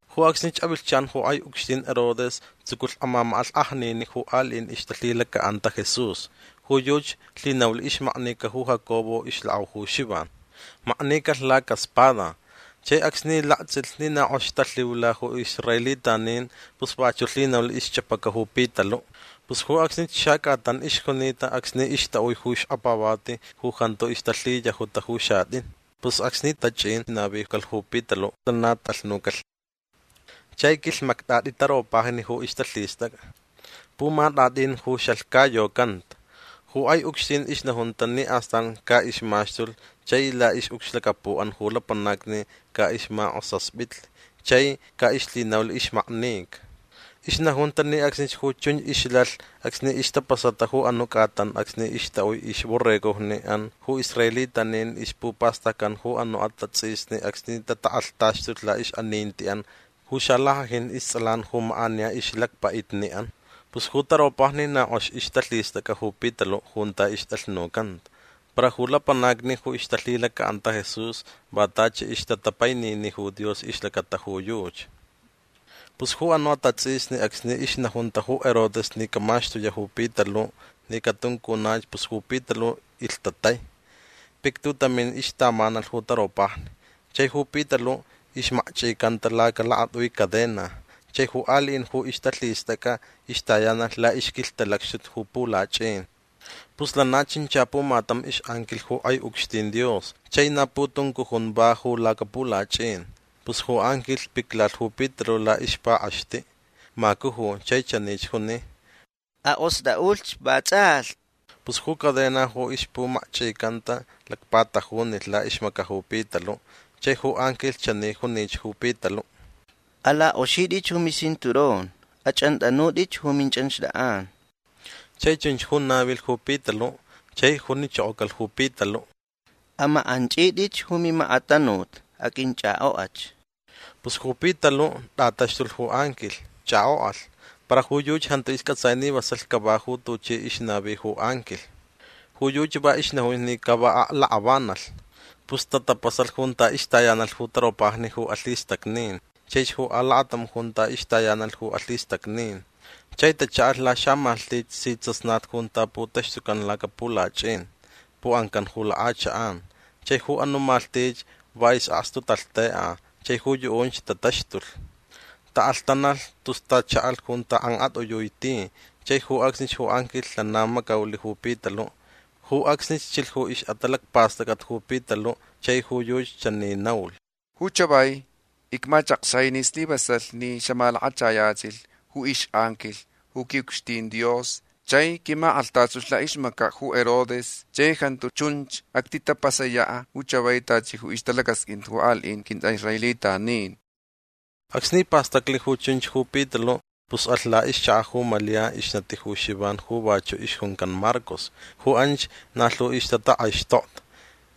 Ju acsnich avilhchan ju kʼai ucxtin Herodes tsuculh amamakʼalhkʼajniniʼ ju aliʼin ju ixtalhilacaʼanta Jesús. Ju yuchi lhinaulh ixmaknica ju Jacobo ixlakʼau ju Xivan. Maknicalh lacaspada. Chai acsni laktsʼilh ni na kʼoxich talhiula ju israelitanin pus vachuʼ lhinaulh ixchʼapaca ju Pitaluʼ. Pus ju acsnich xacʼatan ixjunita acsni ixtaʼui ju xkapavati ju jantu ixtalhiyajuta ju xatʼin. Pus acsni tachʼin navicalh ju Pitaluʼ lana tʼalhnucalh. Chai quilhmaktʼatʼi taropajni ju ixtalhistʼacʼa. Pumatʼatʼin ju xalhcayocanta. Ju kʼai ucxtin ixnajunta ni astan caʼixmaxtulh chai laʼixʼucxlacapuʼan ju lapanacni caʼixmakʼosaspitlh chai caʼixlhinaulh ixmaknica. Ixnajunta ni acsnich ju chunch ixlalh acsni ixtapasata ju anuʼ cʼatan acsni ixtaʼui ixborregoʼan ju israelitanin ixpupastaccan ju anuʼ atatsʼisni acsni tatakʼalhtaxtulh laʼixʼanintiʼan ju xalackʼajin istsʼalan ju makʼaniya ixlacpaʼitniʼan. Pus ju taropajni na kʼox ixtalhistʼacʼa ju Pitaluʼ junta ixtʼalhnucanta. Para ju lapanacni ju ixtalhilacaʼanta Jesús va tachi ixtatapainini ju Dios ixlacata ju yuchi. Pus ju anuʼ atatsʼisni acsni ixnajunta ju Herodes ni camaxtuyaʼ ju Pitaluʼ ni catuncunach pus ju Pitaluʼ ilhtatai. Pictutamin ixtamanalh ju taropajni. Chai ju Pitaluʼ ixmakchʼicanta lacalakatʼui cadena. Chai ju aliʼin ju ixtalhistʼacʼa ixtayanalh laʼixquilhtalacxtut ju pulachʼin. Pus lana chincha pumatam ixʼanquilh ju kʼai ucxtin Dios chai na putuncujun va ju lacapulachʼin. Pus ju anquilh piclalh ju Pitaluʼ laʼixpakʼaxtiʼ. Macuju chai chanich juni: ―Akʼostʼaʼulhch vatsʼalhti. Pus ju cadena ju ixpumakchʼicanta lacpatajunilh laʼixmacaʼ ju Pitaluʼ. Chai ju anquilh chani junich ju Pitaluʼ: ―Alakʼoxitʼich ju micinturón. Achʼantʼanutʼich ju minchʼanxtʼakʼan. Chai chunch ju navilh ju Pitaluʼ. Chai junichokocalh ju Pitaluʼ: ―Amakʼanchʼitʼich ju mimakatanut. Aqʼuinchʼakʼokʼach. Pus ju Pitaluʼ tʼataxtulh ju anquilh. Chʼakʼokʼalh. Para ju yuchi jantu iscʼatsai ni vasalh cava ju tuchi ixnavi ju anquilh. Ju yuchi va ixnajunch ni ca va aklakʼavanalh. Pus tatapasalh junta ixtayanalh ju taropajni ju alhistacnin chaich ju alacatam junta ixtayanalh ju alhistacnin. Chai tachaʼalh laxamalhtich si tsasnat junta putaxtucan lacapulachʼin. Puʼancan ju lakʼachakʼan. Chai ju anuʼ malhtich va isʼakstu talhtekʼa chai ju yuʼunch tataxtulh. Taʼalhtanalh tus tachaʼalh junta kʼankʼatʼiyui ti chai ju acsnich ju anquilh lana macaulh ju Pitaluʼ. Ju acsnich chilh ju ixʼatalacpastʼacʼat ju Pitaluʼ chai ju yuchi chani naulh: ―Ju chavai icmachakxai ni slivasalhch ni xamalakachayachilh ju ixʼanquilh ju quiʼucxtin Dios chai quimakʼalhtaxtulh laʼixmacaʼ ju Herodes chai jantu chunch actitapasayaʼ ju chavai tachi ju ixtalacasqʼuin ju aliʼin quintʼaʼisraelitanin. Acsni pastaclh ju chunch ju Pitaluʼ pus alh laʼixchakaʼ ju Malia ixnati ju Xivan ju vachuʼ ixjuncan Marcos. Ju anch na lhu ixtatakʼaixtokta.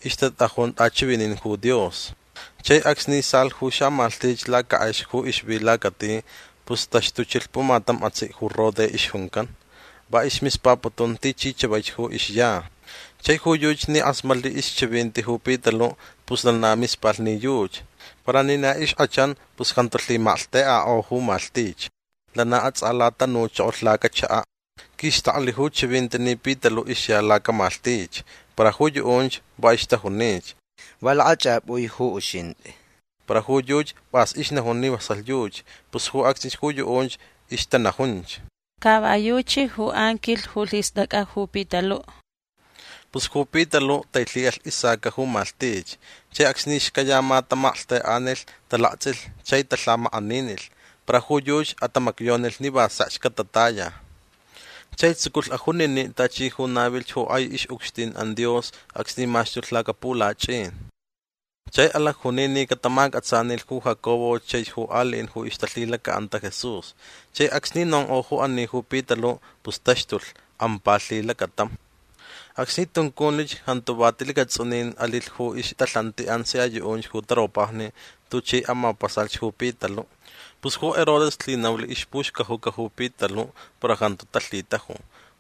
Ixtatʼajun tʼachivinin ju Dios. Chai acsni salh ju xamalhtich lacakʼex ju ixvi lacati pus taxtuchilh pumatam atsiʼ ju Rode ixjuncan. Va ismispaputun tichi chavaich ju ixya. Chai ju yuchi ni kʼasmatnilh ixchivinti ju Pitaluʼ pus lana mispalh ni yuchi. Para ni na ixkʼachan pus jantu lhimalhtekʼakʼo ju malhtich. Lana atsʼalatanuchokolh lacachakaʼ. Quixtaklh ju chivinti ni Pitaluʼ ixya lacamalhtich. Para ju yuʼunch va ixtajunich: ―Va lakʼachʼapʼui ju uxintʼi. Para ju yuchi pʼas ixnajun ni vasalh yuchi. Pus ju acsnich ju yuʼunch ixtanajunch: ―Ca va yuchi ju anquilh ju lhistʼacʼa ju Pitaluʼ. Pus ju Pitaluʼ tailhiʼalh isaca ju malhtich. Chai acsni xcayama tamalhtekʼanilh talaktsʼilh chai talhamakʼaninilh. Para ju yuchi atamacyonilh ni va sekch catataya. Chai tsuculh ajuniniʼ tachi ju navilh ju kʼai ixʼucxtinʼan Dios acsni maxtulh lacapulachʼin. Chai alacjuni ni catamacʼatsanilh ju Jacobo chaich ju aliʼin ju ixtalhilacaʼanta Jesús. Chai acsni nonkʼo ju ani ju Pitaluʼ pus taxtulh. Ampa lhilacatam. Acsni tunculhch jantuch va ti lacatsʼunin alilh ju ixtalhantiʼan sia yuʼunch ju taropajni tuchi amapasalh ju Pitaluʼ. Pus ju Herodes lhinaulh ixpuxcajuca ju Pitaluʼ para jantu talhitaju.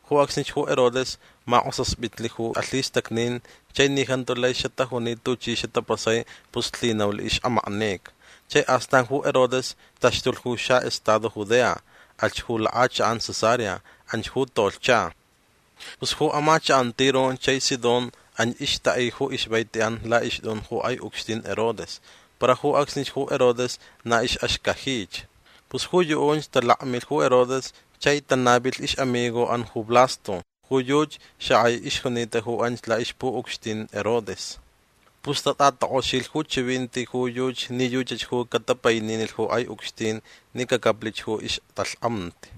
Ju acsnich ju Herodes makʼosaspitlh ju alhistacnin chai ni jantu lai xatajuni tuchi xatapasai pus lhinaulh ixʼamaknica. Chai astan ju Herodes taxtulh ju xaʼestado Judea. Alhch ju lakʼachakʼan Cesarea. Anch ju tolhcha. Pus ju amachakʼan Tiro chai Sidón anch ixtaʼi ju ixvaitiʼan laʼixtʼun ju kʼai ucxtin Herodes. Para ju acsnich ju Herodes na ixʼaxcajich. Pus ju yuʼunch talakmilh ju Herodes chai tanavilh ixʼamigoʼan ju Blasto. Ju yuchi xakʼai ixjunita ju anch laʼixpuʼucxtin Herodes. Pus tatʼatakʼoxilh ju chivinti ju yuchi ni yuchach ju catapaininilh ju kʼai ucxtin ni cacaplich ju ixtalhkʼamti.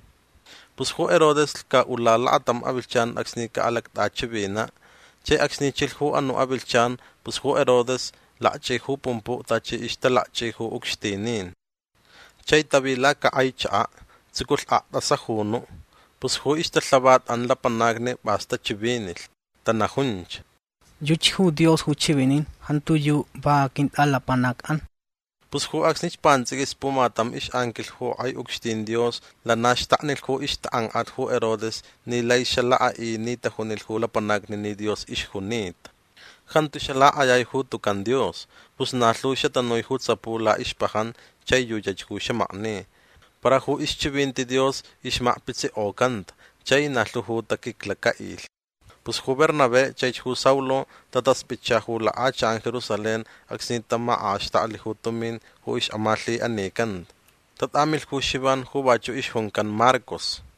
Pus ju Herodes lhcaʼula lakatam avilhchan acsni caʼalactʼachivinaʼ. Chai acsni chilh ju anuʼ avilhchan pus ju Herodes lakchʼi ju pumpuʼ tachi ixtalakchʼi ju ucxtinin. Chai tavi lacakʼai chakaʼ. Tsuculh aktʼasajunuʼ. Pus ju ixtalhavatʼan lapanacni pʼas tachivinilh. Tanajunch: ―Yuchi ju Dios ju chivinin. Jantiyuʼ va quintʼalapanacʼan. Pus ju acsnich pantsʼiquis pumatam ixʼanquilh ju kʼai ucxtin Dios lana xtaknilh ju ixtakʼankʼat ju Herodes ni lai xalakʼaʼi ni tajunilh ju lapanacni ni Dios ixjunita. Jantu xalakʼayai ju tucan Dios. Pus na lhu xatanui ju tsapu laʼixpajan chai yuchach ju xamakni. Para ixchivinti Dios ixmakpitsikʼocanta chai na lhu ju taquiclacaʼilh. Pus ju Bernabé chaich ju Saulo tataspʼitcha ju lakʼachakʼan Jerusalén acsni tamakʼaxtaklh ju tumin ju ixʼamalhiʼanican. Tatʼamilh ju Xivan ju vachuʼ ixjuncan Marcos.